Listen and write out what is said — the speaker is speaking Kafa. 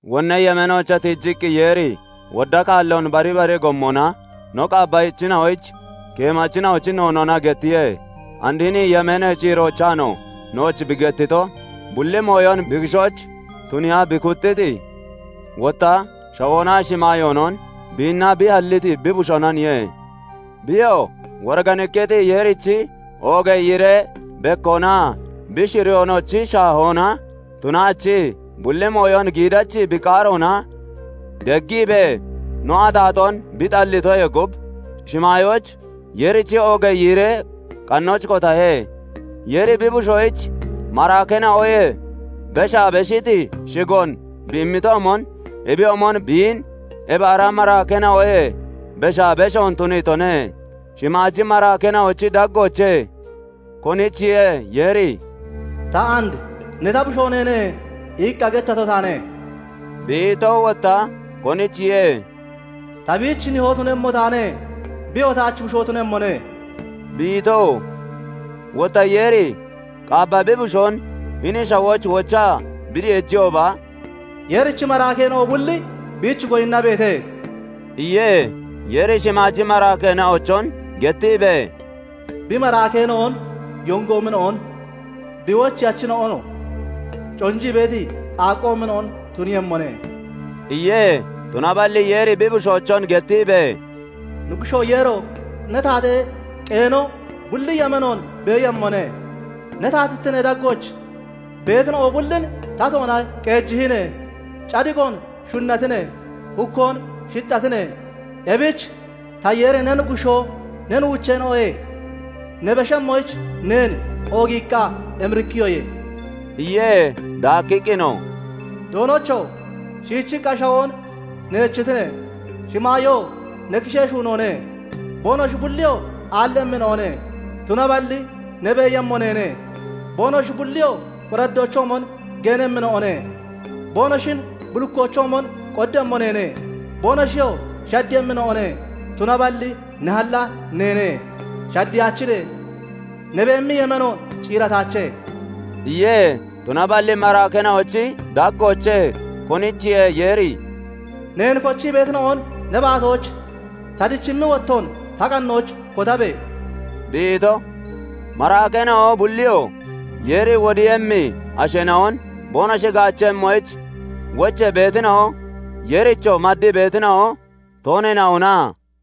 Wonnee yemeenoochee tiijiqqi, Yeeri wodda kaalloon bari bara gommona no qaabbachina'oyich keemachina'ochi noonoona gettiye. And hini yemeenee ciiroochaanoo nooch bi gettito, bulli mooyon bi kishooch tuniiya bi kuxxiti, wotta shawoonaa shimaayoonon biinna bi halliti bi Bushoonaniye. Biyoo woriganikkiti Yeerichi oogee yiiree bekkoonaa bi shuriyoonochi shaahoona tunaachii, bulli mooyon giidachi bi qaaroona deggiibee, no axaaxoon bi xalliitoyee gub, shimaayooch Yeerichi oogee yiiree qannooch kotahe. Yeeri bi bushoyich maraakeena'oyee beshaa beshiti shigoon bi immitoomon, ebiyoomon biin ebi ara maraakeena'oyee beshaa beshoon tuniitone. Shimaaji maraakeena'ochi daggoochee konichiye Yeeri "Ta and 'Ne, ta Bushoo neene' iqqa gettato taane" bi ito? Wotta konichiye "Ta biich Nihoo tunemmo taane; biyoo taach Bushoo tunemmone" bi ito? Wotta Yeeri Qaabba bi Bushoon hini shawooch wochaa bi deejiyooba, "Yeerichi maraakeena'o bulli biich goyinnabeete" iye. Yeeri shimaaji maraakeena'ochon gettiibee, "Bi maraakeena'on yongoomina'on, Bi wocheyachina'onoo conjii beeti qaaqqoomina'on tuniiyemmone" iye. Tunaballi Yeeri bi Bushoochon gettiibee, "Nuggushoo Yeero! Ne taatee qeeno bulli yemeenoon beeyemmone; Ne taatittinee daggooch beetina'o bullin tatoona qeejihine. Cadiqoon shunnatine; hukkoon shixxatine; Ebich ta Yeeri ne Nuggushoo ne nuucheena'oyee ne beshemmoyich neen oogiiqqa emirikkiyoye" iye. Daakkiqqinoo, "Doonocho! Shiichiqqa shawoon neechitine; shimaayoo ne kishee shuunoone; Boonoshi bulliyoo aallemmina'one; tunaballi ne beeyemmo neene. Boonoshi bulliyoo qoraddoochoomon geenemmina'one. Boonoshin bullikkoochoomon qoddemmo neene; boonoshiyoo shaddeeyemmina'one; Tunaballi ne halla neene; shaddeyaachine; ne beemi yemeeno ciirataache" iye. Tunaballi maraakeena'ochi daggoochee konichiye Yeeri "Neen kochii beetina'on ne baatooch ta dichimmi wottoon ta qannooch kotabe!" bi ito? Maraakeena'o bulliyoo Yeeri wodiiyemmi asheena'on boonoshi gaachemmoyich wochee beetina'o, Yeerichoo maddii beetina'o tooneena'ona?